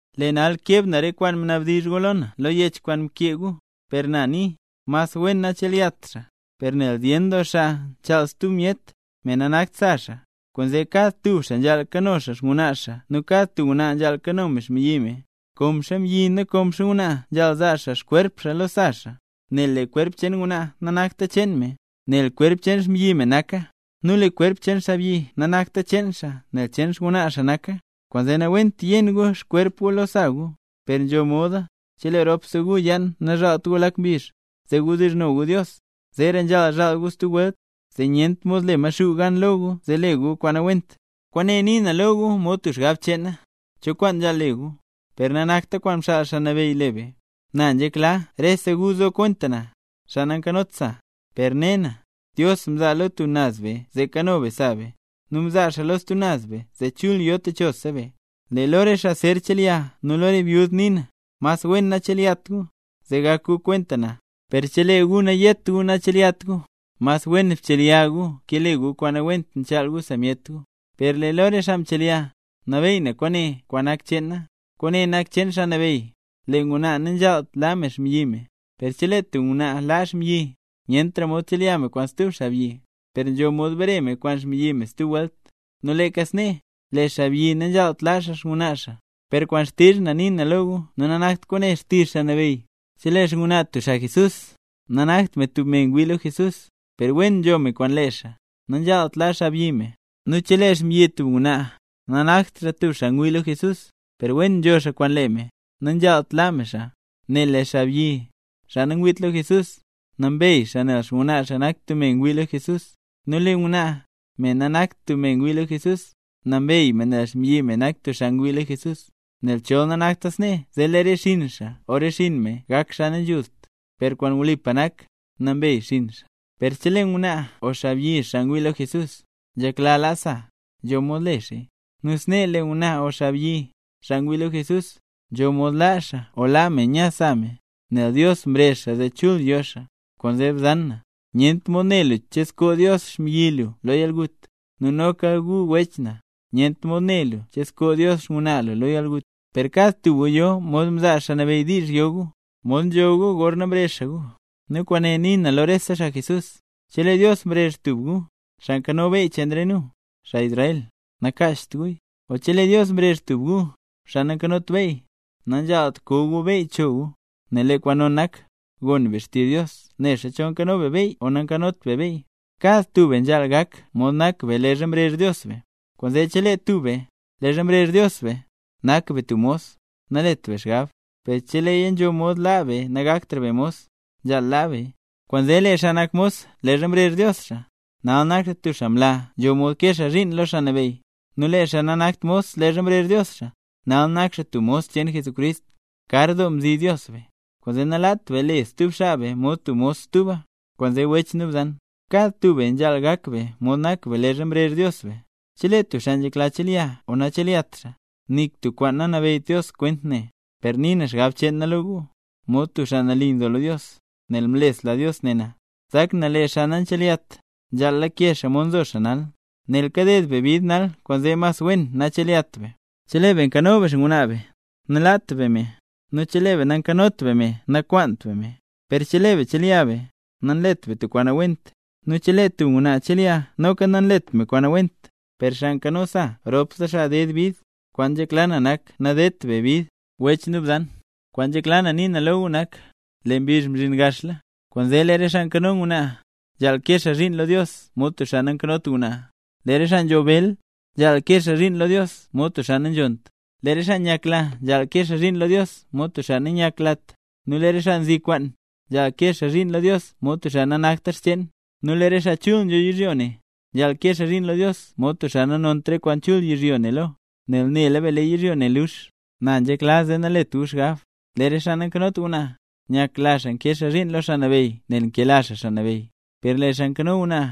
Lee nal keb na re kwaan mnabdizh gu lo na lo yech kwaan mkee gu. Per na nii: Mas wen nachelyat xaa; per nel zyen doo xaa nchaal stub myet, me nanakt sa xaa, kwaanzee kad tub xaa nzhaal kano xaa xngwnaa xaa nu kad ngwnaa nzhaal kano me xmbyi me. Konxa xaabyi nu konxa ngwnaa nzhaal zaa xaa xkwerp xaa lo sa xaa. Nel lee kwerp cheen ngwnaa nanakta cheen me, nel cheen xmbyi me naka; nu lee kwerp cheen xaabyi nanakta cheen xaa nel cheen xngwnaa xaa naka. Kwaanzee nawent yen gu xkwerp gu lo sa gu. Per nzho moda, cheleeya ropse gu yaan nazhaalt gu lak mbizh, zee wdizhno gu Dios. Zeera nzhaal zhaal gu stub welt, zee nyent mod le Maxuu gan lo gu zee le gu kwaan nawent. Kwaane nii na lo gu mod tub xgab cheen na, cho kwaan nzhaal le gu, per nanakt kwaan mxaal Xaa Nabeyy le be. Na nzhekla rese gu zo kwenta na, xaa nankanot sa. Per ne na, Dios mzaa lo tub naz be zee kano be sa be, nu mzaa xaa lo stub naz be zee chul yo techosa be. Lee lo re xaa zer chelya nu lo re byud nii na, mas wen nachelyat gu, zee gak gu kwenta na. Per chelee gu nayet gu nachelyat gu, mas wen chelya gu ke le gu kwaan nawent nchaal gu sa myet gu. Per lee lo re xaa mchelyala, nabeey na kwaane kwaan nanakt cheen na, kwaane nak cheen Xaa Nabeyy: Lee ngwnaa nanzhaalt laa me xmbyi me. Per chelee tub ngwnaa laa xmbyi, nyentra mod chelya me kwaan stub xaabyi, per nzho mod bare me kwaan xmbyi me stub welt. Nu leeka snee, lee xaabyi nanzhaalt laa xaa xngwnaa xaa. Per kwaan xtizh na nii na lo gu, nu nanakt kwaane xtizh Xaa Nabeyy: Chelee xngwnaa tub xaa Jesús, nanakt me tub me ngwii lo Jesús, per wen nzho me kwaan lee xaa, nanzhaalt laa xaabyi me. Nu chelee xmbyi tub ngwnaa, nanakt xaa tub xaa ngwii lo Jesús, per wen nzho xaa kwaan lee me, nanzhaalt laa me xaa. Nel lee xaabyi, xaa nangwiit lo Jesús, nambey xaa nel xngwnaa xaa nak tub me ngwii lo Jesús; nu lee ngwnaa, me nanakt tub me ngwii lo Jesús, nambey me nel xmbyi me nak tub xaa ngwii lo Jesús. Nel chol nanakta snee, zee lee re xinn xaa o xinn me gak xaa nanzhult, per kwaan wlipa nak, nambey xinn xaa. Per chelee ngwnaa o xaabyi, xaa nangwiit lo Jesús, nzhekla laa sa, nzho mod le xaaya. Nu snee lee ngwnaa o xaabyi, xaa ngwii lo Jesús, nzho mod laa xaa o laa me nya sa me, nel Dios mrezh xaa zee chul yo xaa. Kwaanzee bzan na, nyent mod ne lu che zkoo Dios xmbyi lu lo yalgut. Nu noka gu wech na, nyent mod ne lu che zkoo Dios xngwnaa lu lo yalgut. Per kad tub gu yo mod mzaa Xaa Nabeyy diizh yo gu, mod nzho gu gorna mrezh xaa gu, nu kwaane nii na lo rese xaa Jesús. Chelee Dios mrezh tub gu, xaa nzho beyy cheen re nu, xaa Israel, nakacht guya, o chelee Dios mrezh tub gu, xaa nanzhot beyy, nanzhaalt koo gu beyy cho gu. Nel lee kwaan non nak, gon be xtizh Dios nexa chol nzho be beyy o nanzhot be beyy. Kad tub be nzhaal gak mod nak be leezha mrezh Dios be. Kwaanzee chelee tub be, leezha mrezh Dios be, nak be tub mos, nalet be xgab, per cheleeya nzho mod laa be nagaktra be mos, nzhaal laa beya. Kwaanzee lee xaa nak mos leezha mrezh Dios xaa, nal nak xaa tub xaa mla nzho mod kee xaa zhiin lo Xaa Nabeyy; nu lee xaa nanakt mos leezha mrezh Dios xaa, nal nak xaa tub mos cheen Jesucrist. Kar doo mzi Dios be, kwaanzee nalaat be le stub xaa be mod tub mos stuba. Kwaanzee wech nu bzan, kad tub be nzhaal gak be mod nak be leezha mrezh Dios be. Chelee tub xaa nzhekla chelya o nachelyat xaa, nik tub kwaan nanabeyyt Dios kwent ne; per nii na xgab cheen na lo gu, nu nali nzo na lo Dios, nel mlesla Dios ne na. Nzak na: Lee xaa nanchelyat, nzhaal lake xaa mod nzo xaa nal, nel kaded be bid nal, kwaanzee mas wen nachelyat be. Chelee be nkano be xngwnaa be, nalaat be me; nu chelee be nankanot be me nakwaant be me. Per chelee be chelya be tub ngwnaa, nanlet be tub kwaan nawent, nu chelee tub ngwnaa chelya noka nanlet me kwaan nawent. Per xaa nkano sa ropse xaa ded bid, kwaan nzhekla na nak nadedt be bid. Wech nu bzan, kwaan nzhekla na nii na lo gu nak: Lee mbizh mzhin gaxla. Kwaanzee lee re xaa nkano ngwnaa, nzhaal kee xaa zhiin lo Dios mod tub xaa nankanot ngwnaa. Lee re xaa nzho bel, nzhaal kee xaa zhiin lo Dios mod tub xaa nanzhonnt, lee re xaa nyakla nzhaal kee xaa zhiin lo Dios mod tub xaa nanyaklat, nu lee re xaa nzi kwaan, nzhaal kee xaa zhiin lo Dios mod tub xaa nanakta xcheen. Nu lee re xaa chul nzho yizhyo ne, nzhaal kee xaa zhiin lo Dios mod tub xaa nanont re kwaan chul yizhyo ne lo, nel nela be lee yizhyo ne lux. Na nzhekla zee nalet gu xgab. Lee re xaa nankanot ngwnaa, nyakla xaa nkee xaa zhiin lo Xaa Nabeyy nel nkela xaa Xaa Nabeyy. Per lee xaa nkano ngwnaa,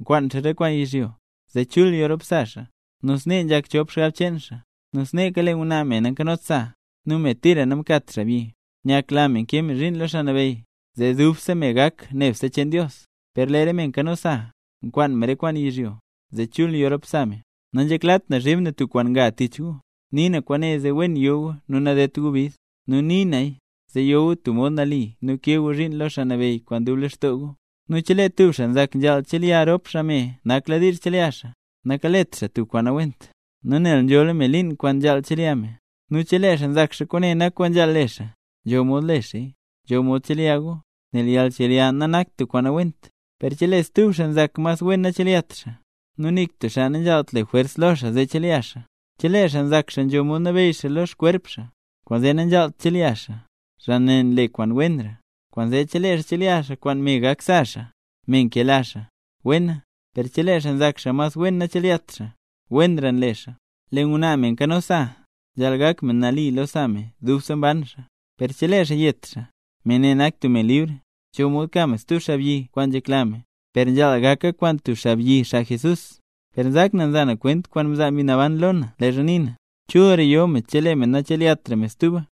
nkwaan xaa re kwaan yizhyo, zee chul yo rop sa xaa, nu snee nzhak chop xgab cheen xaa. Nu sneeka lee ngwnaa, me nankanot sa, nu me tira namkat xaabyi, nyakla me nkee me zhiin lo Xaa Nabeyy, zee dubse me gak nebse cheen Dios. Per lee re me nkano sa, nkwaan me re kwaan yizhyo, zee chul yo rop sa me. Nanzheklat na zhiib na tub kwaan nga tich gu, nii na kwaane zee wen yo gu nu nadedt gu bid. Nu nii naya, zee yo gu tub mod nali nu kee gu zhiin lo Xaa Nabeyy kwaan dub lextoo gu. Nu chelee tub xaa nzak nzhaal chelya rop xaa me nakladiizh chelya xaa, nakalet xaa tub kwaan nawent, nu nel nzhola me liin kwaan nzhaal chelya me. Nu chelee xaa nzak xaa kwaane nak kwaan nzhaal le xaa, nzho mod le xaaya. Nzho mod chelya gu, nel yalnchelya nanakta tub kwaan nawent. Per chelee stub xaa nzak mas wen nachelyat xaa, nu nik tub xaa nanzhaalt le jwers lo xaa zee chelya xaa. Chelee xaa nzak xaa nzho mod nabeyy xaa xkwerp xaa, kwaanzee nanzhaalt chelya xaa, xaa ne nle kwaan wenra. Kwaanzee chelee xaa chelya xaa kwaan me gak sa xaa, me nkela xaa, wena; per chelee xaa nzak xaa mas wen nachelyat xaa, wenra nle xaa. Lee ngwnaa me nkano sa, nzhaal gak me nali lo sa me dubse mban xaa; per chelee xaa yet xaa, me ne nak tub me libr, nzho mod ka me stub xaabyi kwaan nzhekla me, per nzhaal gaka kwaan tub xaa Jesús. Per nzak na nza na kwent kwaan mzaa Mbi Naban lo na leezha nii na, chulra yo me chelee me nachelyat me stuba.